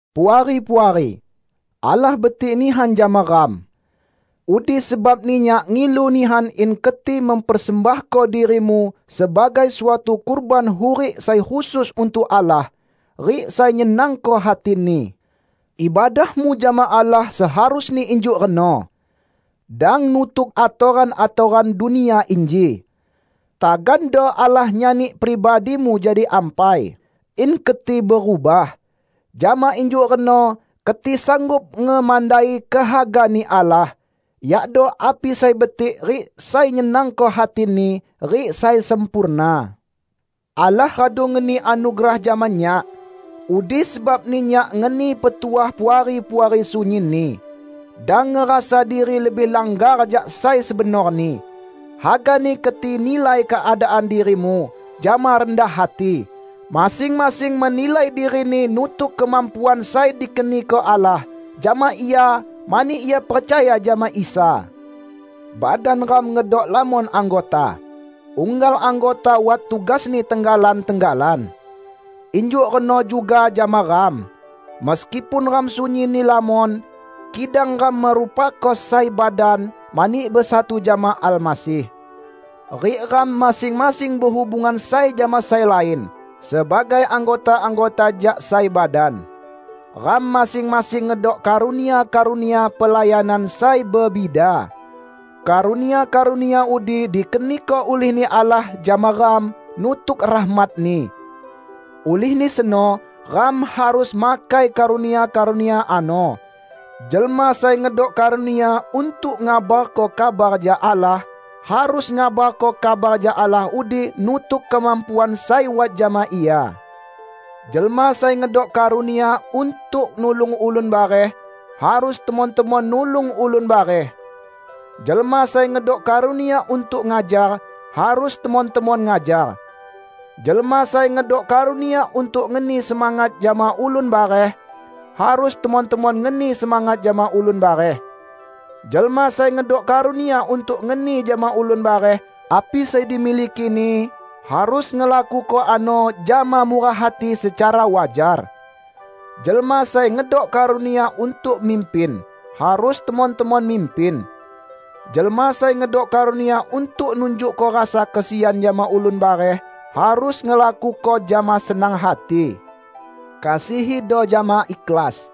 Puari-puari! Allah betik nihan jama ram. Udi sebabni nyak ngilu nihan in keti mempersembahko dirimu sebagai suatu kurban hurik sai khusus untuk Allah rik sai nyenangko hati-Ni. Ibadahmu jama Allah seharusni injuk reno. Dang nutuk atoran-atoran dunia inji. Tagando Allah nyani pribadimu jadi ampai, in keti berubah. Jama injuk reno keti sanggup ngemandai kehaga-Ni Allah -- yakdo api sai betik rik sai nyenangko hati-Ni rik sai sempurna. Allah radu ngeni anugerah jama nyak. Udi sebabni nyak ngeni petuah Puari-puari sunyinni: Dang ngerasa diri lebih langgar jak sai sebenorni. Hagani keti nilai keadaan dirimu jama rendah hati; masing-masing menilai dirini nutuk kemampuan sai dikeniko Allah jama ia mani ia percaya jama Isa. Badan ram ngedok lamon anggota. Unggal anggota wat tugasni tenggalan-tenggalan. Injuk reno juga jama ram. Meskipun ram sunyinni lamon, kidang ram merupako sai badan mani besatu jama Almasih. Rik ram masing-masing behubungan sai jama sai lain sebagai anggota-anggota jak sai badan. Ram masing-masing ngedok karunia-karunia pelayanan sai bebida. Karunia-karunia udi dikeniko ulih-Ni Allah jama ram nutuk rahmat-Ni. Ulihni seno ram harus makai karunia-karunia ano. Jelma sai ngedok karunia untuk ngabarko kabar jak Allah, harus ngabarko kabar jak Allah udi nutuk kemampuan sai wat jama ia. Jelma sai ngedok karunia untuk nulung ulun bareh, harus temon-temon nulung ulun bareh. Jelma sai ngedok karunia untuk ngajar, harus temon-temon ngajar. Jelma sai ngedok karunia untuk ngeni semangat jama ulun bareh, harus temon-temon ngeni semangat jama ulun bareh. Jelma sai ngedok karunia untuk ngeni jama ulun bareh api sai dimilikini, harus ngelakuko ano jama murah hati secara wajar. Jelma sai ngedok karunia untuk mimpin, harus temon-temon mimpin. Jelma sai ngedok karunia untuk nunjukko rasa kesian jama ulun bareh, harus ngelakuko jama senang hati. Kasihido jama ikhlas.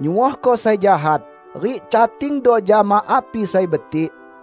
Nyuohko sai jahat, rik catingdo jama api sai betik.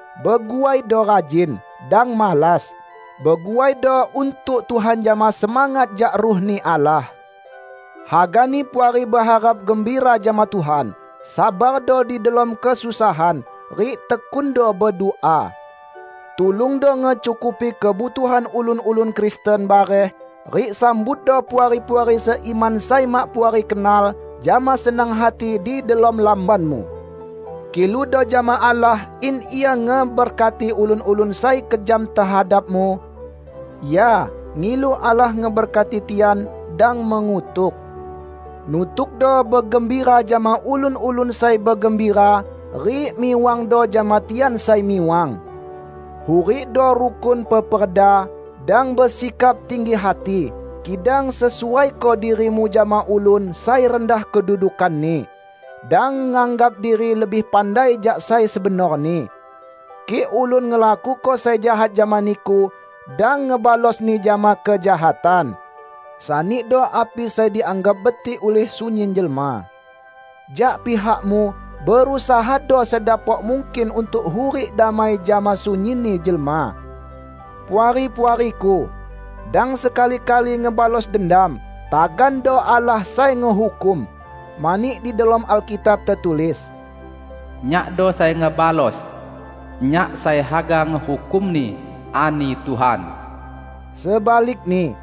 Beguaido rajin. Dang malas. Beguaido untuk Tuhan jama semangat jak Ruh-Ni Allah. Hagani Puari beharap gembira jama Tuhan, sabardo di delom kesusahan, rik tekundo bedua. Tulungdo ngecukupi kebutuhan ulun-ulun Kristen bareh rik sambutdo Puari-puari seiman sai mak Puari kenal, jama senang hati di delom lambanmu. Kiludo jama Allah in Ia ngeberkati ulun-ulun sai kejam tehadapmu. Ya, ngilu Allah ngeberkati tian, dang mengutuk. Nutukdo begembira jama ulun-ulun sai begembira, rik miwangdo jama tian sai miwang. Hurikdo rukun peperda. Dang besikap tinggi hati, kidang sesuaiko dirimu jama ulun sai rendah kedudukanni. Dang nganggap diri lebih pandai jak sai sebenorni. Kik ulun ngelakuko sai jahat jama niku, dang ngebalosni jama kejahatan. Sanido api sai dianggap betik ulih sunyin jelma. Jak pihakmu, berusahado sedapok mungkin untuk hurik damai jama sunyinni jelma. Puari-puariku! Dang sekali-kali ngebalos dendam, tagando Allah sai ngehukum. Mani di delom Alkitab tetulis, "Nyakdo sai ngebalos. Nyak sai haga ngehukumni, ani Tuhan." Sebalikni,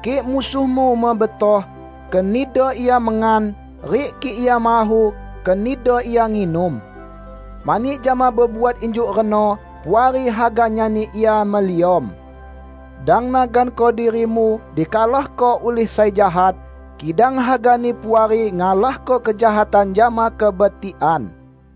kik musuhmu mebetoh, kenido ia mengan; rik kik ia mahu, kenido ia nginum. Mani jama bebuat injuk reno, Puari haga nyani ia meliom. Dang naganko dirimu dikalahko ulih sai jahat, kidang hagani Puari ngalahko kejahatan jama kebetikan.